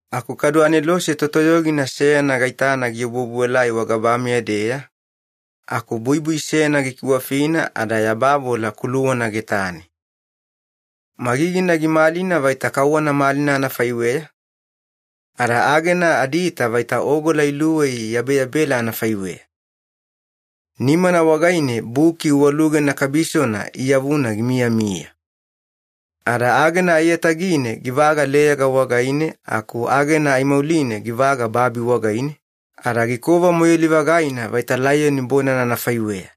Aku kadu anelose totoyogina seyana gaitana giobuobuelai wagabameya-deya, aku buibui seyana gikiwafina ada yabavola kuluwana getane. Magigina gimalina vaita kauwana malina anafaiweya, ada agena adiita vaita ogola iluwei iyabeyabela anafaiweya. Nimana wagaine buki uwalugena kabisona iyavuna gimiyamiya. Ada agena aiyatagine givaga leyaga wagaine aku agena aimauline givaga babi wagaine, ada gikova moiyali-vagaina vaita laiyoni bonana anafaiweya.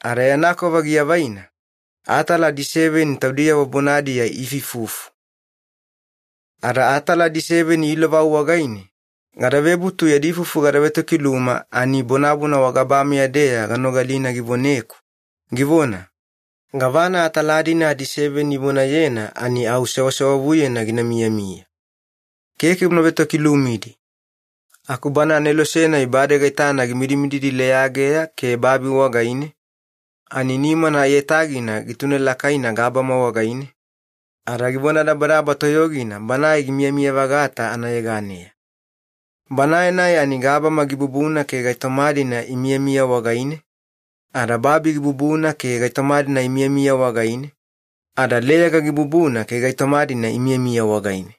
Ada yana kova giavaina, atala adiseveni taudiyavo bonadiya iifuifufu. Ada atala adiseveni ilovau wagaine, gada vebutu yadi ifufu gada vetokiluma ani bonabona wagabameya-deya ganogalina givoneku, givona, “Gavana atala-dina adiseveni ivonayena ani au sewasewavuyena gina miyamiya. Keke una vetokilumidi.” Aku bana anelose-nai bade gaitana gimidimididi leyageya ke babi wagaine, ani nimana aiyatagina gitunelakaina gabama wagaine, ada givonadabadaba toyogina Banae gimiyamiya-vagata anayeganeya. Banae-nai ani gabama gibubuna ke gaitoma-dina imiyamiya wagaine, ada babi gibubuna ke gaitoma-dina imiyamiya wagaine, ada leyaga gibubuna ke gaitoma-dina imiyamiya wagaine.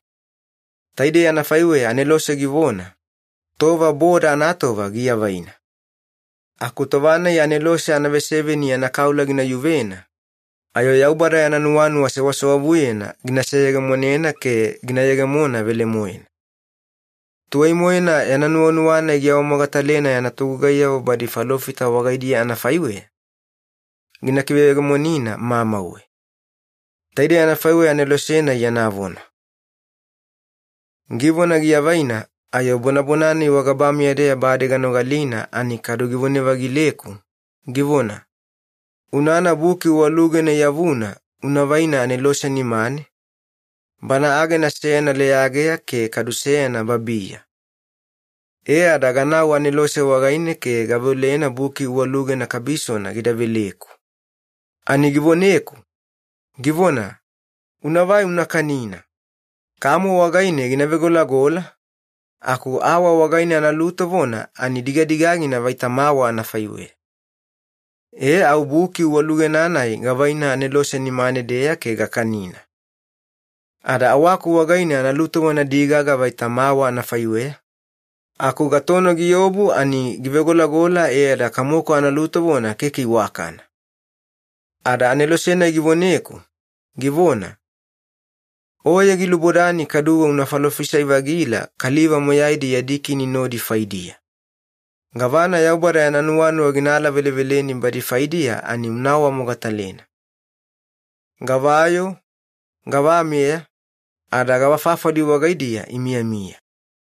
Taidei anafaiweya anelose givona, “Tova boda anatova giavaina. Aku tova-nai anelose anaveseveni yana kaula gina yuvena, ayo Yaubada yana nuwanuwa sewasewavuyena gina seyegemonena ke gina yegemona velemoena. Tuwai-moena yana nuwanuwa-nai giawamogatalena yana togugaiyavo badi falofita wagaidiya anafaiweya, gina kiveyegemonina mamauwe.” Taidei anafaiweya anelose-nai yana vona. Givona giavaina, ayo bonabona-nai wagabameya-deya bade ganogalina ani kadu givona-vagileku, givona, “Unana buki uwalugena iyavuna una vaina anelose nimane, bana agena seyana leyageya ke kadu seyana babiya.” E ada ganau anelose wagaine ke gaveolena buki uwalugena kabisona gida veleku. Ani givoneku, givona, “Unavai una kanina. Kamo wagaine gina vegolagola, aku awa wagaine analutovona ani digadigagina vaita mawa anafaiweya.” E au buki uwalugena-nai gavaina anelose nimane-deya ke gakanina. Ada awaku wagaine analutovona gidigaga vaita mawa anafaiweya, aku gatono giobu ani givegolagola e ada kamoku analutovona keke iwakana. Ada anelose-nai givoneku, givona, “Oye gilubodani kaduwe una falofisai-vagila kaliva moyaidi yadi kini nodi faidiya. Gavana Yaubada yana nuwanuwa gina alaveleveleni badi faidiya ani una awamogatalena. Gavayoo, gavameya, ada gavafafali wagaidiya imiyamiya.”